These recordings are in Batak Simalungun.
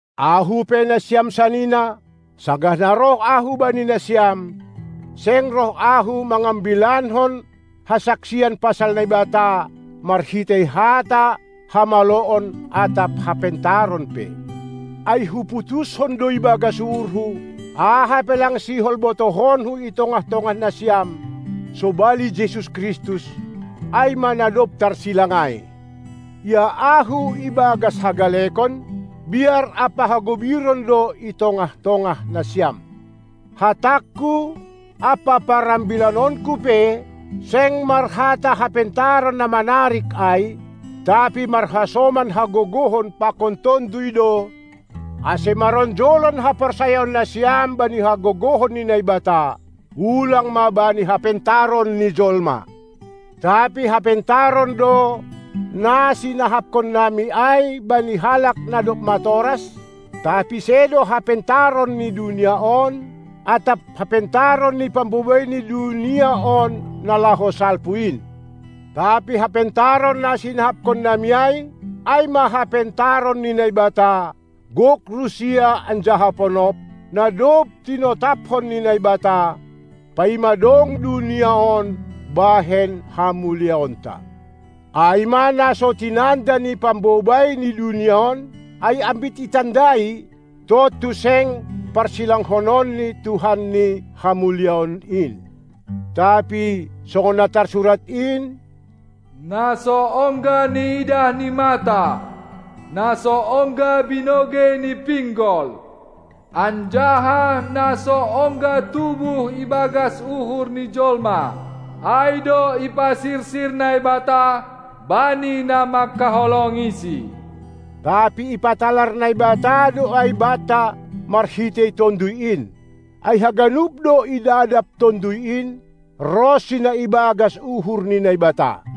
Ahu pe nasiam sanina, sanggah na roh ahu bani nasiam, seng roh ahu mangambilankon hasaksian pasal Naibata marhitei hata hamaloon atap hapentaron pe. Ai huputuskon do ibagas uhurhu, aha pe lang sihol botohonku i tongah-tongah nasiam sobali Jesus Kristus, ai ma na dob tarsilang ai. Ia ahu, ibagas hagalekon, biar ampa hagobiron do i tongah-tongah nasiam. Hatangku ampa parambilanonku pe, seng marhata hapentaron na manarik ai, tapi marhasoman hagogohon pakon Tonduy do, ase maronjolan haporsayaon nasiam bani hagogohon ni Naibata, ulang ma bani hapentaron ni jolma. Tapi hapentaron do, na sinahapkonnami ai bani halak na dob matoras, tapi sedo hapentaron ni dunia on atap hapentaron ni pambobai ni dunia on, na laho salpu in. Tapi hapentaron na sinahapkonnami ai, ai ma hapentaron ni Naibata, gok rusia anjaha ponop, na dob tinotapkon ni Naibata, paima dong dunia on bahen hamuliaonta. Ai ma na so tinanda ni pambobai ni dunia on, ai ambit itandai, tontu seng parsilangkononni Tuhan ni hamuliaon in. Tapi songon na tarsurat in: Na so ongga niidah ni mata, na so ongga binogei ni pinggol anjaha na so ongga tubuh ibagas uhur ni jolma, ai do ipasirsir Naibata bani na manghaholongiSi. Tapi ipatalar Naibata do ai banta marhitei Tonduy in. Ai haganup do idadap Tonduy in, ronsi na ibagas uhur ni Naibata.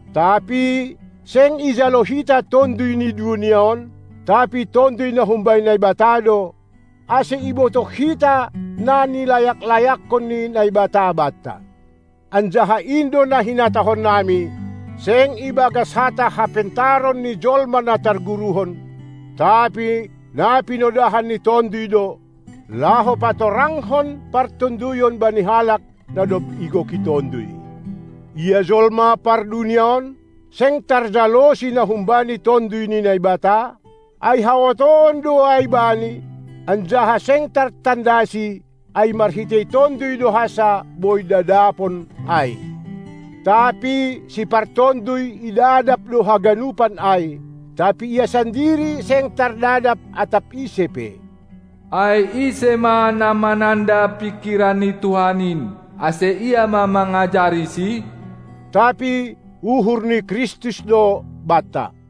Tapi seng ijalo hita tonduy ni dunia on, tapi Tonduy na humbani Naibata do, ase ibotoh hita na nilayak-layakkon ni Naibata banta. Anjaha in do na hinatahonnami, seng ibagas hata hapentaron ni jolma na targuruhon, tapi na pinodahan ni Tonduy do, laho patorangkon partonduyon bani halak na dob igoki Tonduy. Ia jolma pardunia on, seng tarjalosi na humbani Tonduy ni Naibata, ai haotoon do ai bani, anjaha seng tartandasi, ai marhitei Tonduy do hansa boi dadapon ai. Tapi sipartonduy idadap do haganupan ai, tapi ia sandiri seng tardadap atap ise pe. Ai ise ma na mananda pingkiran ni Tuhan in, ase ia ma mangajariSi? Tapi uhur ni Kristus do banta.